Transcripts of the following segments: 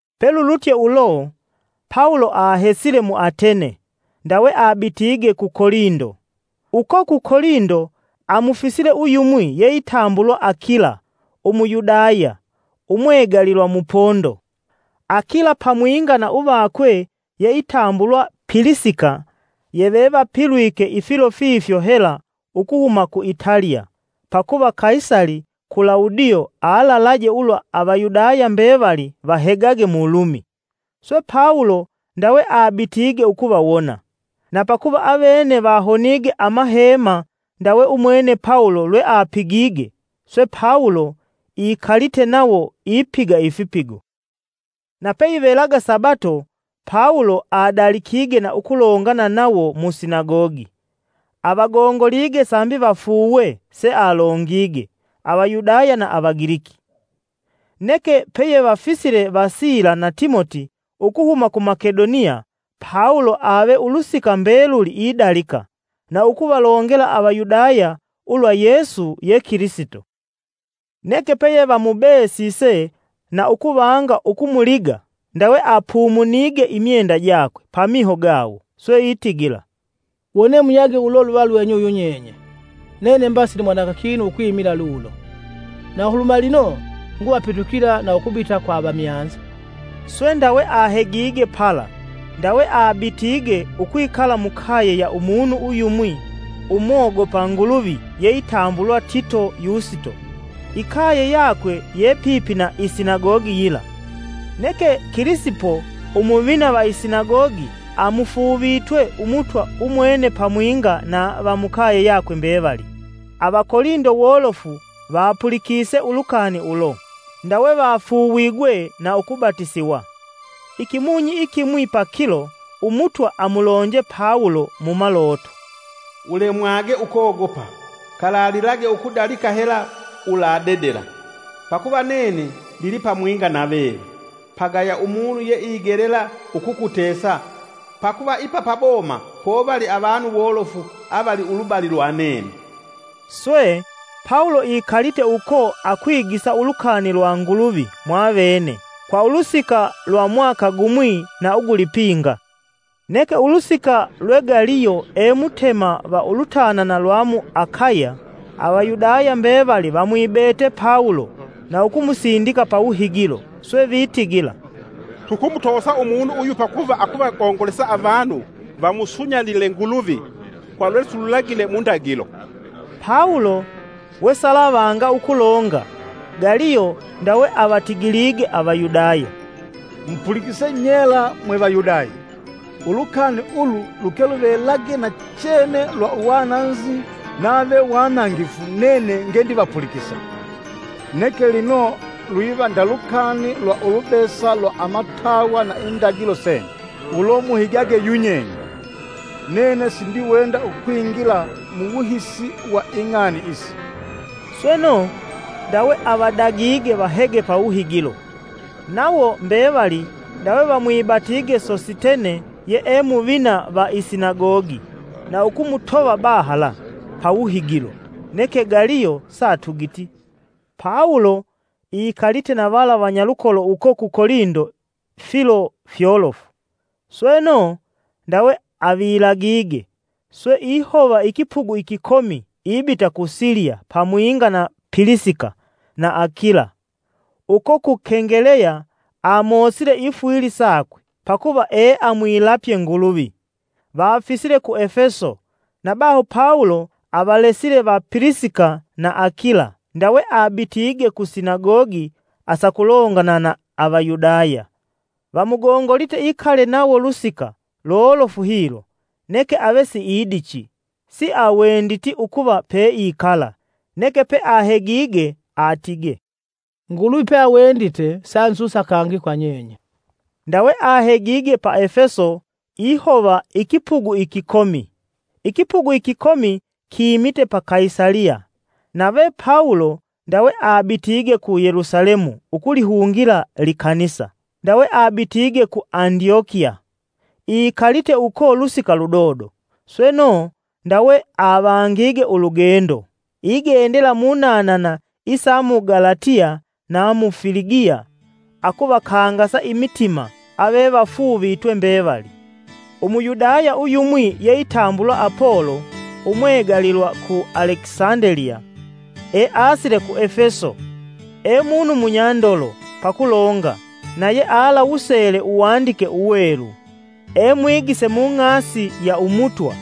Pelulutye ulo, Pawulo ahesile mu Atene, ndawe abitige ku Kolindo. Uko ku Kolindo, amufisile uyumwi yeitambulwa Akila Umuyudaya umwegalilwa mu Pondo. Akila pamwinga na uvakwe yeitambulwa Pilisika, yevevapilwike ifilo fifyo hela ukuhuma ku Italiya pakuva Kaisali Kulawudio alalaje ulwa Avayudaya mbevali vahegage mu Lumi. Swe Pawulo ndawe abitige ukuvawona, na pakuva avene vahonige amahema ndawe umwene Pawulo lweapigige, swe Pawulo ikalite nawo ipiga ifipigo. Na peyivelaga Sabato Pawulo adalikige na ukulongana nawo mu sinagogi, avagongolige sambi vafuuwe sealongige Avayudaya na Avagiliki. Neke peyevafisile va Sila na Timoti ukuhuma ku Makedoniya, Pawulo ave ulusika mbeluli idalika, na ukuvalongela Avayudaya ulwa Yesu ye Kilisito. Neke peyevamubesise na ukuvanga ukumuliga, ndawe apumunige imyenda jakwe pamiho gawo swe itigila, “Wone muyage ulo luva lwenyu yunyenye; nene mba sindimwananga kinu ukwimila lulo. Na uluhuma lino nguvapitukila na ukubita kwa avamyanza.” Swe, ndawe ahegige pala ndawe abitige ukwikala mukaye ya umunu uyumwi umogopa Nguluvi yeitambulwa Tito Yusito. Ikaye yakwe ye pipi na isinagogi yila. Neke Kilisipo, Umuvina va isinagogi, amufuuvitwe Umutwa umwene pamwinga na va mukaye yakwe mbevali. Avakolindo wolofu vapulikise ulukani ulo, ndawe vafuuwigwe na ukubatisiwa. Ikimunyi ikimwi pakilo, Umutwa amulonje Pawulo mumaloto; “Ulemwage ukogopa, kalalilage ukudalika hela uladedela, pakuva nene ndilipamwinga na veve. Pagaya umunu yeigelela ukukutesa pakuva ipa paboma povali avanu wolofu avali ulubali lwa nene” Swe, Pawulo ikalite uko akwigisa ulukani lwa Nguluvi mwavene kwa ulusika lwa mwaka gumwi na ugulipinga. Neke ulusika lwe Galiyo e Mutema va ulutanana lwa mu Akaya, Avayudaya mbevali vamwibete Pawulo na ukumusindika pawuhigilo. Swe vitigila, “Tukumutosa umunu uyu pakuva akuvagongolesa avanu vamusunyalile Nguluvi kwa lwesilulagile mundagilo.” Pawulo wesalavanga ukulonga, Galiyo ndawe avatigilige Avayudaya, “Mupulikise nyela mwe Vayudaya! Ulukani ulu luke luvelage nachene lwa uwananzi nave wanangifu nene nge ndivapulikisa. Neke lino lwiva nda lukani lwa ulubesa lwa amatawa na indagilo senyu, ulo muhigage yunyenye. Nene sindiwenda ukwingila mu wuhisi wa ing'ani isi!” Sweno, ndawe avadagige vahege pawuhigilo. Nawo mbevali ndawe vamwibatige Sositene ye e muvina va isinagogi, na ukumutova bahala pawuhigilo. Neke Galiyo satugiti. Pawulo ikalite na vala vanyalukolo uko ku Kolindo filo fyolofu. Sweno, ndawe avilagige, swe ihova ikipugu ikikomi ibita ku Siliya pamwinga na Pilisika na Akila. Uko ku Kengeleya, amosile ifwili sakwe pakuva eamwilapye Nguluvi. Vafisile ku Efeso na baho Pawulo avalesile va Pilisika na Akila, ndawe abitige ku Sinagogi, asakulongana na Avayudaya. Vamugongolite ikale nawo lusika lolofu hilo, neke ave siidichi. (siawenditi ukuva peikala) Neke peahegige, atige, “Nguluvi peawendite sanzusa kangi kwa nyenye.” Ndawe ahegige pa Efeso ihova ikipugu ikikomi. Ikipugu ikikomi kimite pa Kaisaliya, nave Pawulo ndawe abitige ku Yelusalemu ukulihungila likanisa, sweno, ndawe abitige ku Andyokiya. Ikalite uko lusika ludodo, sweno, ndawe avangige ulugendo, igendela munanana isa mu Galatiya na mu Filigiya akuvakangasa imitima avevafuuvitwe mbevali. Umuyudaya uyumwi yeitambulwa Apolo umwegalilwa ku Alekisandeliya, easile ku Efeso. E munu munyandolo pakulonga na yealawusele Uwandike Uwelu. E mwigise mu ng'asi ya Umutwa,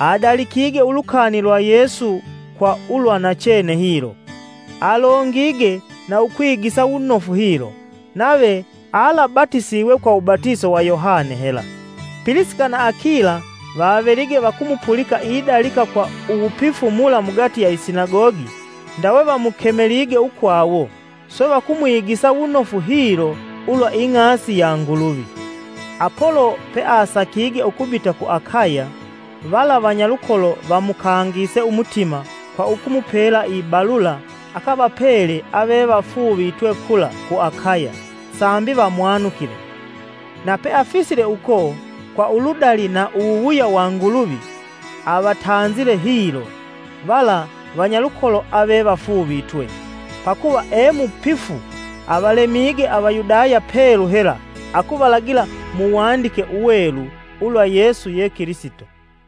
adalikige ulukani lwa Yesu kwa ulwa nachene hilo. Alongige na ukwigisa wunofu hilo, nave alaabatisiwe kwa uwubatiso wa Yohane hela. Pilisika na Akila vavelige vakumupulika idalika kwa uwupifu mula mugati ya i sinagogi, ndawe vamukemelige ukwawo swe vakumwigisa wunofu hilo ulwa ing'asi ya Nguluvi. Apolo peasakige ukubita ku Akaya, vala vanyalukolo vamukangise umutima kwa ukumupela ibalula akavapele avevafuuvitwe kula ku Akaya sambi vamwanukile. Na peafisile uko, kwa uludali na uwuwuya wa Nguluvi, avatanzile hilo vala vanyalukolo avevafuuvitwe; pakuva emupifu avalemige Avayudaya pelu hela akuvalagila muwandike uwelu ulwa Yesu ye Kilisito.